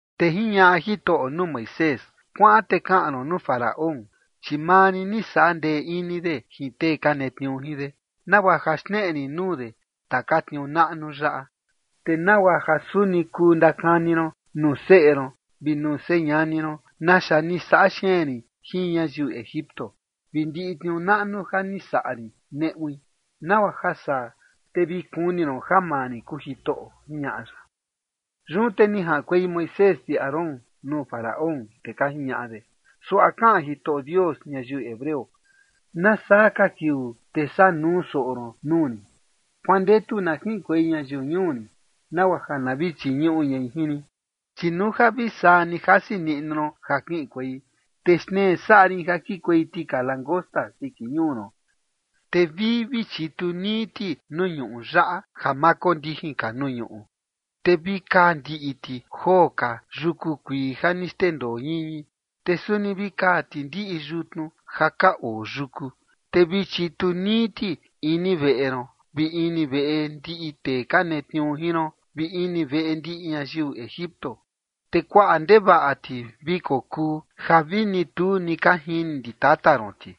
Te jiñaꞌa Jitoꞌo nuu Moisés: ―Kuaꞌan te kaꞌan ron nuu Faraón, chi maa rin ni saꞌa ndee ini de jin tee ka netniuu jin de, nagua ja xneꞌe rin nuu de taka tniuu naꞌnu yaꞌa. Te nagua ja suni kuu ndakani ron nuu seꞌe ron vi nuu señani ron naxa ni saꞌa xeen rin jin ñayiu Egipto vi ndiꞌi tniuu naꞌnu ja ni saꞌa rin neꞌui. Nagua ja saa te vi kuni ron ja maa rin kuu Jitoꞌo ―jiñaꞌa ya. Yun te ni jaꞌankuei Moisés vi Aarón nuu Faraón, te ka jiñaꞌa de: ―Suaꞌa kaꞌan Jitoꞌo Dios ñayiu hebreo: “¿Nasaa ka kiuu te saa nuu soꞌo ron nuu rin? Kuandetu na kiꞌinkuei ñayiu ñuu rin, nagua ja na vi chiñuꞌu ñai jin rin. Chi nuu ja vi saa ni jasi niꞌnu ron ja kiꞌinkuei, te xtnee saꞌa rin ja kikuei tika langosta siki ñuu ron. Te vii vi chitu nii ti nuu ñuu yaꞌa ja vi ma kondijin ka nuu ñuꞌu, te vi kaa ndiꞌi ti joo ka yuku kuii ja ni xndendoo ñiñi, te suni vi kaa ti ndiꞌi yutnu ja ka oo yuku. Te vi chitu nii ti ini veꞌe ron vi ini veꞌe ndiꞌi tee ka netniuu jin ron vi ini veꞌe ndiꞌi ñayiu Egipto. Te kuaꞌa ndevaꞌa ti vi kokuu ja vini tu ni ka jini ndi tata ron ti,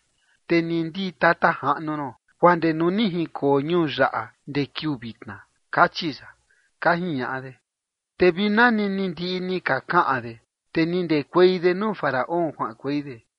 te ni ndi tata jaꞌnu ron, guaa ndee nuu ni jinkoo ñuu yaꞌa ndee kiuu vitna”, kachi ya ―ka jiñaꞌa de. Te vi nani ni ndiꞌi ni ka kaꞌan de, te ni ndekuei de nuu Faraón kuaꞌankuei de.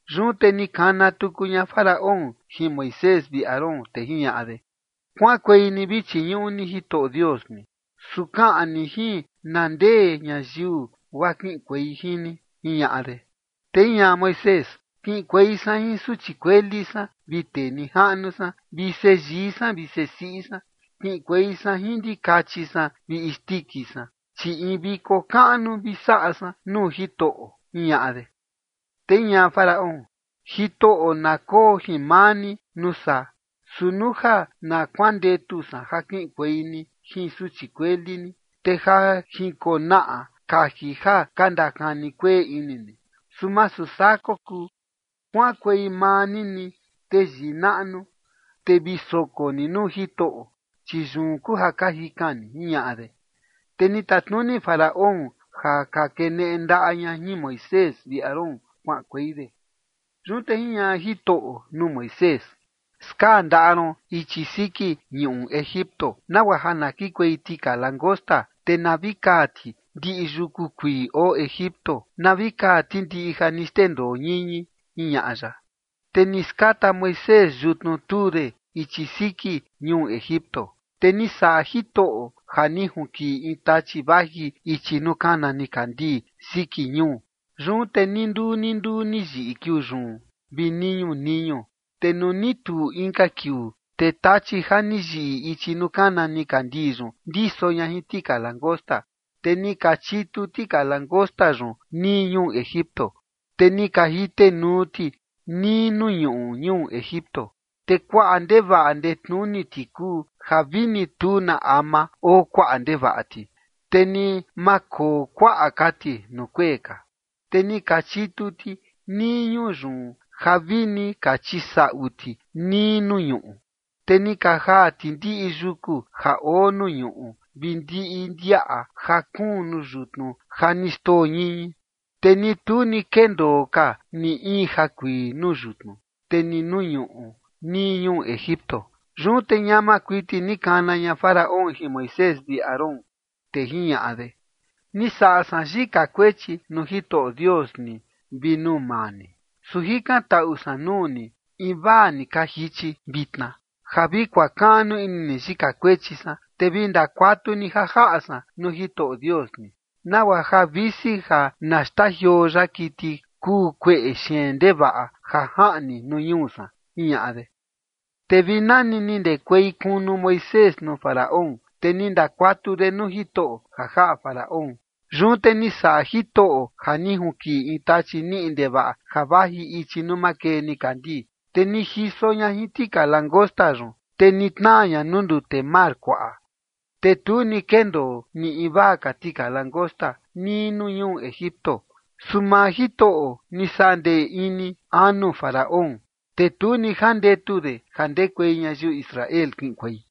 Yun te ni kana tuku ña Faraón jin Moisés vi Aarón, te jiñaꞌa de: ―Kuaꞌankuei ni vi chiñuꞌu ni Jitoꞌo Dios ni. Su kaꞌan ni jin na ndee ñayiu guaa kiꞌinkuei jin ni ―jiñaꞌa de. Te jiñaꞌa Moisés: ―Kiꞌinkuei san jin suchi kueli san vi tee nijaꞌnu san, vi seyii san vi sesiꞌi san. Kiꞌinkuei san jin ndikachi san vi isndiki san, chi in viko kaꞌnu vi saꞌa san nuu Jitoꞌo ―jiñaꞌa de. Te jiñaꞌa Faraón: ―Jitoꞌo na koo jin maa ni nuu saa. Su nuu ja na kuandetu san ja kiꞌinkuei ni jin suchi kueli ni, te ja jinkonaꞌa kaji ja ka ndakani kueꞌe ini ni. Su masu saa kokuu. Kuaꞌankuei maa ni ni teyii naꞌnu, te vi soko ni nuu Jitoꞌo, chi yun kuu ja ka jikan ni ―jiñaꞌa de. Te ni tatnuni Faraón ja ka keneꞌe ndaꞌa ña jin Moisés vi Aarón kuaꞌankuei de. Yun te jiñaꞌa Jitoꞌo nuu Moisés: ―Skaa ndaꞌa ron ichi siki ñuꞌu Egipto nagua ja na kikuei tika langosta, te na vi kaa ti ndiꞌi yuku kuii oo Egipto, na vi kaa ti ndiꞌi ja ni xndendoo ñiñi ―jiñaꞌa ya. Te ni skata Moisés yutnu tuu de ichi siki ñuu Egipto, te ni saꞌa Jitoꞌo ja ni junkiꞌi in tachi vaji ichi nuu kana nikandii siki ñuu. Yun te ninduu ninduu ni yiꞌi kiuu yun vi niñu niñu. Te nuu ni tuu inka kiuu, te tachi ja ni yiꞌi ichi nuu kana nikandii yun ndiso ña jin tika langosta. Te ni ka chitu tika langosta yun nii ñuu Egipto, te ni ka jitenuu ti nii nuu ñuꞌu ñuu Egipto, te kuaꞌa ndevaꞌa ndetnuni ti kuu ja vini tu na ama oo kuaꞌa ndevaꞌa ti, te ni ma koo kuaꞌa ka ti nuu kuee ka. Te ni ka chitu ti nii ñuu yun ja vi ni ka chisaꞌu ti nii nuu ñuꞌu. Te ni ka jaa ti ndiꞌi yuku ja oo nuu ñuꞌu vi ndiꞌi ndiaꞌa ja kuun nuu yutnu ja ni xndoo ñiñi. Te ni tu ni kendoo ka ni in jakuii nuu yutnu, te ni nuu ñuꞌu nii ñuu Egipto. Yun te ñama kuiti ni kana ña Faraón jin Moisés vi Aarón, te jiñaꞌa de: ―Ni saꞌa san yika kuechi nuu Jitoꞌo Dios ni vi nuu maa ni. Su jikantaꞌu san nuu ni invaa ni ka jichi vitna, ja vi kuakaꞌnu ini ni yika kuechi san, te vi ndakuatu ni ja jaꞌa san nuu Jitoꞌo Dios ni, nagua ja visi ja na xtajioo ya kiti kuu kueꞌe xeen ndevaꞌa ja jaꞌni nuu ñuu san ―jiñaꞌa de. Te vi nani ni ndekuei kunu Moisés nuu Faraón, te ni ndakuatu de nuu Jitoꞌo ja jaꞌa Faraón. Yun te ni saꞌa Jitoꞌo ja ni junkiꞌi in tachi niꞌi ndevaꞌa ja vaji ichi nuu makee nikandii, te ni jiso ña jin tika langosta yun, te ni tnaa ña nuu ndute mar kuaꞌa. Te tu ni kendoo ni invaa ka tika langosta nii nuu ñuu Egipto. Su maa Jitoꞌo ni saꞌa ndee ini anu Faraón, te tu ni jandetu de ja ndekuei ñayiu Israel kiꞌinkuei.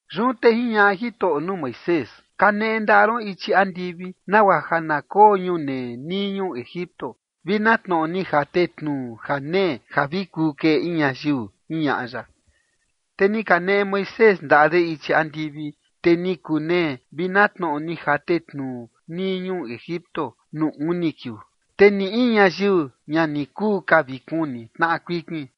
Yun te jiñaꞌa Jitoꞌo nuu Moisés: ―Kaneꞌe ndaꞌa ron ichi andivi, nagua ja na koo ñunee nii Egipto vi na tnoꞌo ni jate tnuu janee ja vi kuu keꞌe in ñayiu ―jiñaꞌa ya. Te ni kaneꞌe Moisés ndaꞌa de ichi andivi, te ni kunee vi na tnoꞌo ni jate tnuu nii ñuu Egipto nuu uni kiuu. Te ni in ñayiu ña ni kuu ka vi kuni tnaꞌa kuikin,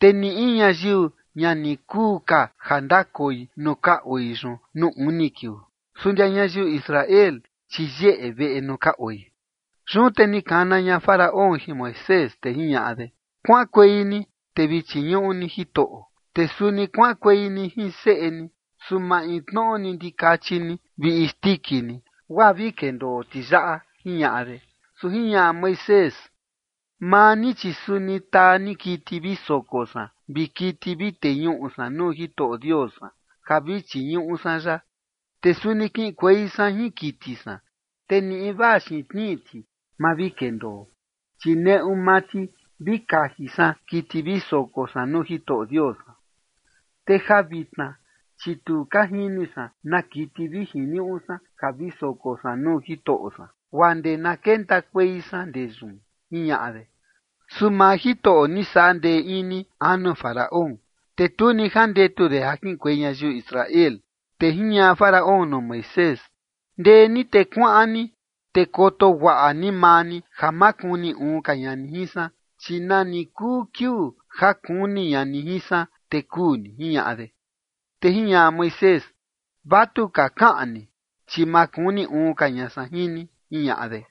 te ni in ñayiu ña ni kuu ka ja ndakoi nuu ka oi yun nuu uni kiuu. Su ndia ñayiu Israel, chi yeꞌe veꞌe nuu ka oi. Yun te ni kana ña Faraón jin Moisés, te jiñaꞌa de: ―Kuaꞌankuei ni te vi chiñuꞌu ni Jitoꞌo, te suni kuaꞌankuei ni jin seꞌe ni, su maintnoꞌo ni ndikachi ni vi isndiki ni, guaa vi kendoo ti yaꞌa ―jiñaꞌa de. Su jiñaꞌa Moisés: ―Maa ni chi suni taa ni kiti vi soko san vi kiti vi teñuꞌu san nuu Jitoꞌo Dios san ja vi chiñuꞌu san ya. Te suni kiꞌinkuei san jin kiti san, te ni invaa xiin tnii ti ma vi kendoo, chi neꞌu maa ti vi kaji san kiti vi soko san nuu Jitoꞌo Dios san. Te ja vitna chi tu ka jini san na kiti vi jiniuꞌu san ja vi soko san nuu Jitoꞌo san, guaa ndee na kentakuei san ndee yun ―jiñaꞌa de. Su maa Jitoꞌo ni saꞌa ndee ini anu Faraón, te tu ni jandetu de ja kiꞌinkuei ñayiu Israel. Te jiñaꞌa Faraón nuu Moisés: ―Ndee ni te kuaꞌan ni te koto guaꞌa ni maa ni ja ma kuni uun ka ña ni jin san, chi nani kuu kiuu ja kuni ña ni jin san, te kuu ni ―jiñaꞌa de. Te jiñaꞌa Moisés: ―Vatuka kaꞌan ni, chi ma kuni uun ka ña san jin ni ―jiñaꞌa de.